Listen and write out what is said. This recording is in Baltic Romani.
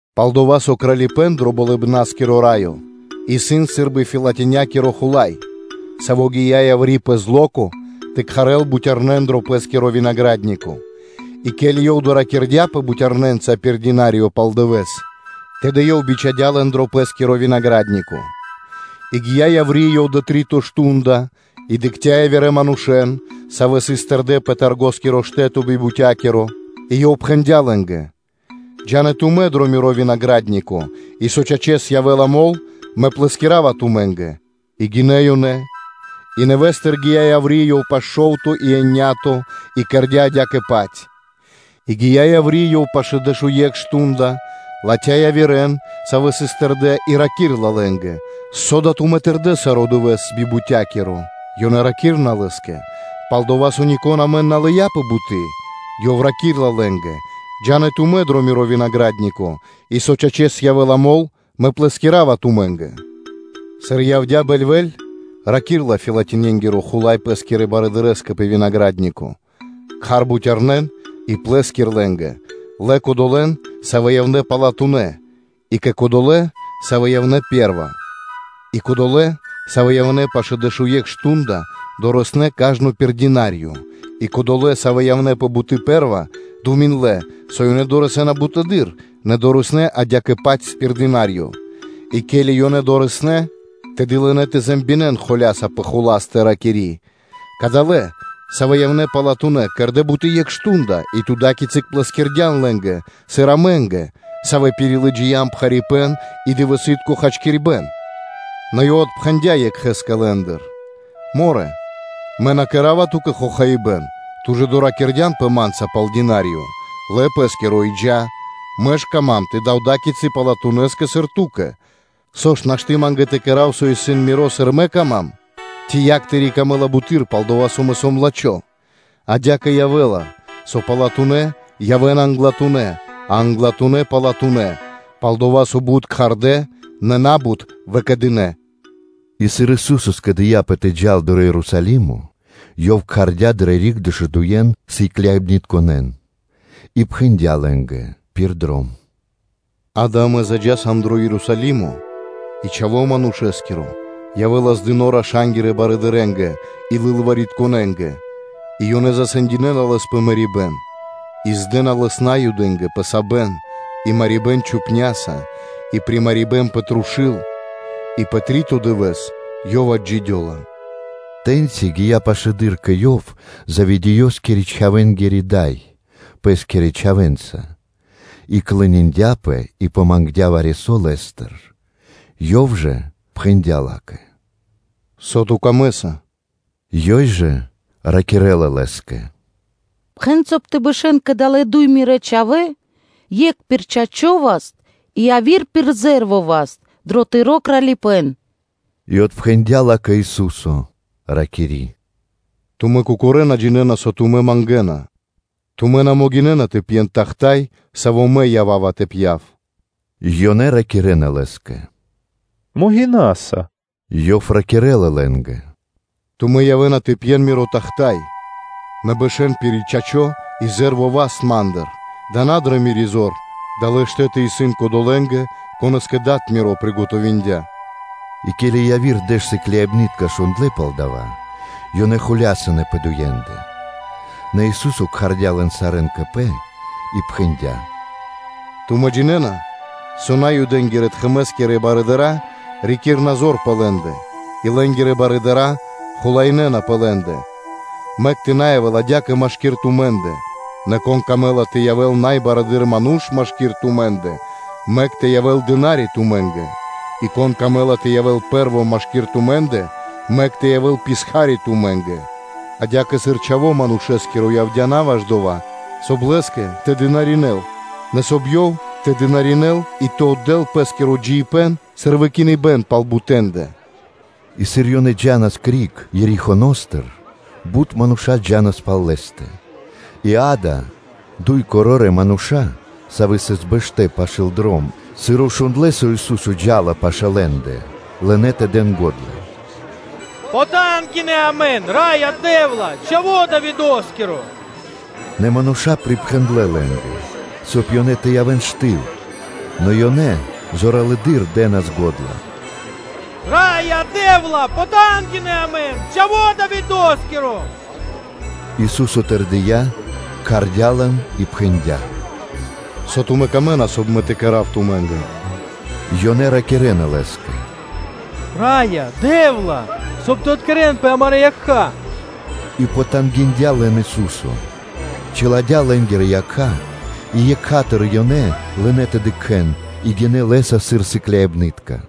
Пал-дова́ со Кралипэ́н дро Болыбна́скиро Раё исын сы́рбы фэлатинякиро хула́й, саво́ гия́ яври́ пэ зло́ко тэ кхарэл бутярнэн дро пэ́скиро винагра́днико (дракхин). И ке́ли ёв доракирдяпэ бутярнэнца пир динариё пал дывэ́с, тэды ёв бичхадя́ лэн дро пэ́скиро винагра́днико. И гия́ яври́ ёв дрэ три́то мардо́ (шту́нда) и дыкхця́ явирэ манушэ́н, савэ́ сыс тэрдэ́ пэ таргоскиро штэ́то би бутякиро; и ёв пхэндя́ лэ́нгэ: ‘Джа́н и тумэ́ дро миро винагра́днико, и со, чачэс, явэ́ла мол, мэ плэскирава тумэ́нгэ.’ И гинэ́ ёнэ. И нэвэ́стыр гия́ яври́ ёв пашэ́ шо́вто и еня́то (биекхэ́скиро дэ́што), и кэрдя́ адя-паць. И гия́ яври́ ёв пашэ́ дэшуе́кх мардэ́ (штунды), латхя́ явирэ́н, савэ́ сыс тэрдэ́ би бутякиро, и раки́рла лэ́нгэ: ‘Со да тумэ́ тэрдэ́ саро́ дывэ́с би бутякиро?’ Ёнэ ракирна лэ́скэ: ‘Пал-дова́ со нико́н амэн на лыя́ пэ буты́.’ Ёв раки́рла лэ́нгэ: ‘Джа́н и тумэ́ дро миро винагра́днико, и со, чачэс, явэ́ла мол, мэ плэскирава тумэ́нгэ.’ Сыр явдя́ бэльвэ́ль, раки́рла фэлатинякиро хула́й пэ́скирэ барыдырэ́скэ пэ винагра́днико: ‘Кхар бутярнэн и плэскир лэ́нгэ, лэ кодолэ́н, савэ́ явнэ́ палатунэ́ и кэ долэ́, савэ́ явнэ́ пэ́рва.’ И кодолэ́, савэ́ явнэ́ пашэ́ дэшуекх мардо́ (шту́нда), дорэснэ́ кажно пир динариё. И кодолэ́, савэ́ явнэ́ пэ буты́ пэ́рва, думиндлэ, со ёнэ дорэсэ́на буты́р, нэ дорэснэ́ адя́кэ-паць пир динариё. И ке́ли ёнэ дорэснэ́ (долынэ), тэды лынэ́ тэ ракирэ́н холя́са тэл накх пэ хуластэ, ракири́: ‘Кадалэ́, савэ́ явнэ́ палатунэ́, кэрдэ́ буты́ екх мардо́ (шту́нда), и ту ада́кицы плэскирдян лэ́нгэ, сыр амэ́нгэ, савэ́ пирилыджиям пхарипэ́н и дывэсы́тко хачкирибэ́н.’ Нэ Ёв отпхэндя́ екхэ́скэ лэ́ндыр: ‘Морэ, мэ на кэра́ва ту́кэ хохаибэ́н; ту ж доракирдянпэ ма́нца пал динариё? Лэ пэ́скиро и джа́. Мэ ж кама́м тэ дав ада́кицы палатунэскэ, сыр ту́кэ: со ж нашты́ ма́нгэ тэ кэра́в, со исын миро, сыр мэ кама́м? Ци якх тыри́ камэ́ла буты́р, пал-дова́ со мэ сом лачхо́?’ Адя́кэ явэ́ла, со палатунэ́ явэ́на англатунэ́, а англатунэ́ явэ́на палатунэ́: палдава́ со бут исын мануша́, савэ́н кхардэ́, нэ на́бут выкэдынэ́.” И сыр Ису́со скэдыяпэ тэ джал дро Ерусалимо, Ёв кхардя́ дрэ риг дэшудуен сыкляибнытконэ́н и пхэндя́ лэ́нгэ пир дром: “Акэ, амэ заджаса дро Ерусалимо, и Чхаво́ Манушэ́скиро явэ́ла здыно раша́нгирэ барыдырэ́нгэ и лылваритконэнгэ, и ёнэ засэндинэна Лэс пэ мэрибэ́н; и здэна Лэс Наюдэ́нгэ пэ сабэн и марибэ́н чупняса и примарибэн пэ трушу́л и пэ три́то дывэ́с Ёв отджидёла.” Тэ́ньци гия́ пашылэды́р кэ Ёв Заведеёскирэ-чхавэнгири дай пэ́скирэ чхавэ́нца, и клониндяпэ и помангдя вари-со Лэ́стыр. Ёв жа пхэндя́ ла́кэ: “Со ту камэ́са?” Ёй жа ракирэ́ла Лэ́скэ: “Пхэн, соб (кай) тэ бэшэ́н кадалэ́ дуй мирэ́ чхавэ́ екх пир чачо́ васт и яви́р пир зэ́рво васт дро Тыро́ Кралипэ́н.” И отпхэндя́ ла́кэ Ису́со, ракири́: “Тумэ́ кокорэ́ на джинэ́на, со тумэ́ мангэна. Тумэ́ на могинэ́на тэ пьен тахта́й (чаша), саво́ Мэ ява́ва тэ пья́в?” Ёнэ ракирэ́на Лэ́скэ: “Могинаса.” Ёв ракирэ́ла лэ́нгэ: “Тумэ́ явэ́на тэ пьен Миро тахта́й, нэ бэшэ́н пир чачо́ и зэ́рво васт Ма́ндыр-дава́ исын на дрэ Мири́ зор, далэ́ штэ́ты исын кодолэ́нгэ, конэ́скэ Дад Миро приготовиндя” И ке́ли яви́р дэш сыкляибны́тка шундлэ́ пал дава́, ёнэ зоралэ́с холясынэ пэ дуендэ. Нэ Ису́со кхардя́ лэн сарэ́н кэ Пэ и пхэндя́: “Тумэ́ джинэ́на, со Наюдэнгирэ-тхэмэ́скирэ барыдыра́ рикирна зор пэ лэ́ндэ, и лэ́нгирэ барыдыра́ хулаинэна пэ лэ́ндэ. Мэк тэ на явэ́л адя́кэ машки́р тумэ́ндэ, нэ кон камэ́ла тэ явэ́л най барэды́р ману́ш машки́р тумэ́ндэ, мэк тэ явэ́л дына́ри (слуга) тумэ́нгэ; и кон камэ́ла тэ явэ́л пэ́рво машки́р тумэ́ндэ; мэк тэ явэ́л слуга (дына́ри) тумэ́нгэ; адя́кэ сыр Чхаво́ Манушэ́скиро явдя́ на ваш дова́, соб (кай) Лэ́скэ тэ дынаринэ́л, нэ соб (кай) Ёв тэ дынаринэ́л и тэ отдэ́л Пэ́скиро джиибэ́н, сыр выкиныбэ́н пал бутэндэ.” И сыр ёнэ джа́нас криг Ерихоностыр, бут мануша́ джа́нас пал Лэ́стэ. И, акэ, дуй корорэ́ мануша́, савэ́ сыс бэштэ́ пашы́л дром, сыр шундлэ́, со Ису́со джа́ла пашэ́ лэ́ндэ, лынэ́ тэ дэн го́дла: “Потангинэ (пожалин) амэн, Раё Дэ́вла, Чхаво́ Давидо́скиро.” Нэ мануша́ припхэндлэ лэ́нгэ, соб (кай) ёнэ тэ явэ́н штыл, нэ ёнэ зоралэды́р дэ́нас го́дла: “Раё Дэ́вла, потангинэ амэн, Чхаво́ Давидо́скиро.” Ису́со тэрдия́, кхардя́ лэн и пхэндя́: “Со тумэ́ камэ́на, соб (кай) Мэ тэ кэра́в тумэ́нгэ?” Ёнэ ракирэ́на Лэ́скэ: “Раё Дэ́вла, соб (кай) тэ откэрэнпэ амарэ́ якха́” И потангиндя лэн Ису́со, чиладя́ лэ́нгирэ якха́; и екха́тыр (сра́зу) ёнэ лынэ́ тэ дыкхэ́н и гинэ́ Лэ́са сыр сыкляибны́тка.